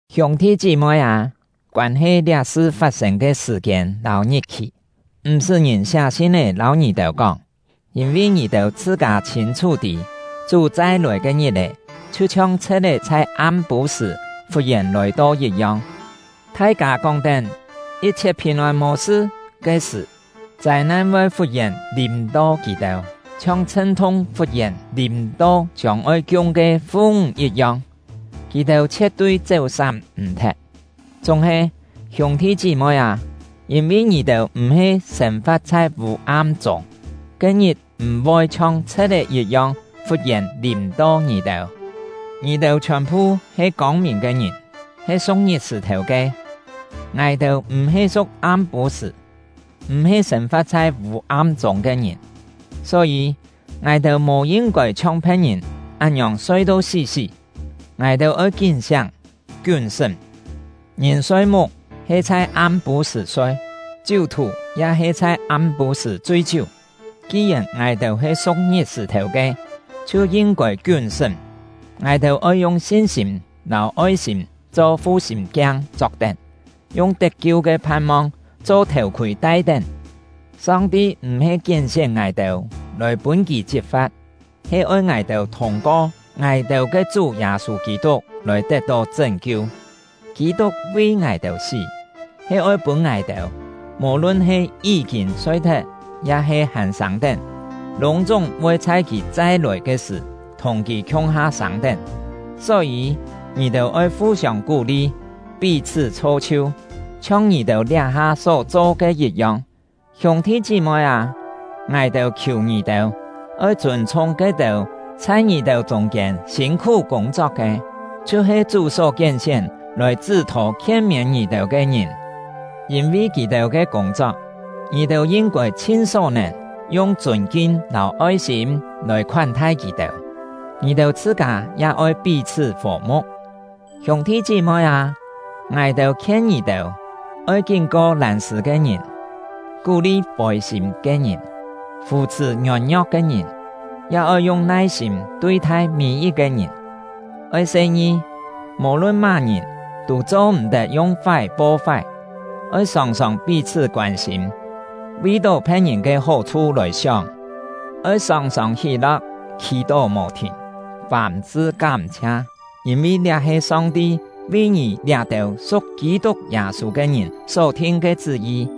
Hiûng-thi chí-moi â, koân-he liá-sṳ fat-sên ke sṳ̀-kiên lâu ngit-khì, m̀-sṳ́ ngìn siá sin-é lâu ngì-têu kóng; yîn-vi ngì-têu chhṳ-kâ chhîn-chhú tî, Chú chai-lòi ke ngit-è chhiu-chhiong chhe̍t-é chhai am-pû-sṳ̀ fut-yèn lòi-to yit-yong. Thai-kâ kóng-tén “Yit-chhiet phìn-ôn, mò sṳ!” ke sṳ̀, châi-nan voi fut-yèn lìm-to kì-têu, chhiong chhṳn-thung fut-yèn lìm-to chiông-oi kiung ke fu-ńg yit-yong; kì-têu chhie̍t-tui chéu-sám m̀-thet. Chúng-he, hiûng-thi chí-moi â, yîn-vi ngì-têu m̀-he sên-fa̍t chhai vû-am chûng, ke-ngit m̀ voi chhiong chhe̍t-é yit-yong fut-yèn lìm-to ngì-têu. Ngì-têu chhiòn-phu he kông-mìn ke ngìn, he su̍k ngit-sṳ̀-thèu ke. Ngài-têu m̀-he su̍k am-pû-sṳ̀, m̀-he sên-fa̍t chhai vû-am chûng ke ngìn. Só-yî, ngài-têu mò yin-kôi chhiong phe̍t-ngìn án-ngiòng soi-to sí-sí; ngài-têu oi kín-siáng, kiún-sṳ́m. Ngìn soi-muk, he chhai am-pû-sṳ̀ soi; chiú-thù ya he chhai am-pû-sṳ̀ chui-chiú. Ki-yèn ngài-têu he su̍k ngit-sṳ̀-thèu ke, chhiu yin-kôi kiún-sṳ́m. Ngài-têu oi yung sin-sîm lâu oi-sîm cho fu-sîm-kiang chok-tén, yung tet-kiu ke phan-mong cho thèu-khûi tai-tén. Song-ti m̀-he kién-sién ngài-têu lòi pûn Kì chit-fa̍t, he oi ngài-têu thûng-ko ngài-têu ke Chú Yâ-sû Kî-tuk lòi tet-tó chṳ́n-kiu. Kî-tuk vi ngài-têu sí, he oi pûn ngài-têu, mò-lun he yí-kîn soi-thet ya-he hàn sâng-tén, lûng-chúng voi chhai kì chai-lòi ke sṳ̀ thùng kì khiung-ha sâng-tén. Só-yî, ngì-têu oi fu-siông kú-li, pí-chhṳ́ chho-chhiu, chhiong ngì-têu liá-ha só cho ke yit-yong. Hiûng-thi chí-moi â, ngài-têu khiù ngì-têu, oi chûn-chhung ke-têu chhai ngì-têu chûng-kiên sîn-khú kûng-chok ke, chhiu-he Chú só kién-sién lòi chṳ́-thô khien-miên ngì-têu ke ngìn. Yîn-vi kì-têu ke kûng-chok, ngì-têu yin-kôi chhin só-nèn yung chûn-kin lâu oi-sîm lòi khoán-thai kì-têu. Ngì-têu chhṳ-kâ ya oi pí-chhṳ́ fò-mu̍k. Hiûng-thi chí-moi â, ngài-têu khien ngì-têu, oi kín-ko lân-sṳ̂ ke ngìn, kú-li fôi-sîm ke ngìn, fù-chhṳ̀ ngiôn-ngio̍k ke ngìn, ya oi yung nai-sîm tui-thai mî-yit-ke ngìn. Oi se-ngi, mò-lun má-ngìn tû cho-m̀-tet yung-fái po-fái; oi sòng-sòng pí-chhṳ́ koân-sîm, vi-tó phe̍t-ngìn ke hó-chhu lòi sióng. Oi sòng-sòng hí-lo̍k, khì-tó mò-thìn, fàm-sṳ kám-chhia; yîn-vi liá he Song-ti vi ngì liá-têu su̍k Kî-tuk Yâ-sû ke ngìn só thin ke chṳ́-yi.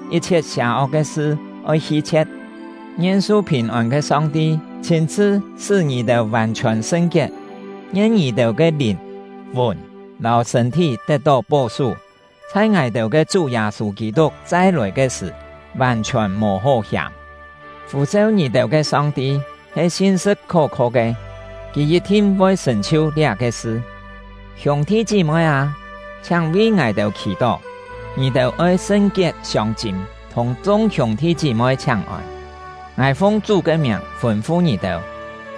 yit-chhiet sià-ok ke sṳ oi hi-chhie̍t. Ngien su phìn-ôn ke Song-ti chhîn-chhṳ sṳ́ ngì-têu vàn-chhiòn sṳn-kiet! Ngien ngì-têu ke lìn, fùn, lâu sṳ̂n-thí tet-tó pó-sú, chhai ngài-têu ke Chú Yâ-sû Kî-tuk chai-lòi ke sṳ̀, vàn-chhiòn mò hó hiàm! Fû-seu ngì-têu ke Song-ti he sin-sṳ̍t khó-kho ke; Kì yit-thin voi sṳ̀n-chhiu liá-ke sṳ. Hiûng-thi chí-moi â, chhiáng vi ngài-têu khì-tó. Ngì-têu oi sṳn-kiet siông-chîm thùng chung hiûng-thi chí-moi chhiáng-ôn. Ngài fung Chú ke miàng fûn-fu ngì-têu,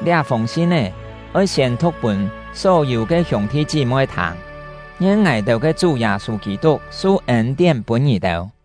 liá-fûng sin-é oi siên-thu̍k pûn só-yû ke hiûng-thi chí-moi thâng. Ngien ngài-têu ke Chú Yâ-sû Kî-tuk su ên-tién pûn ngì-têu!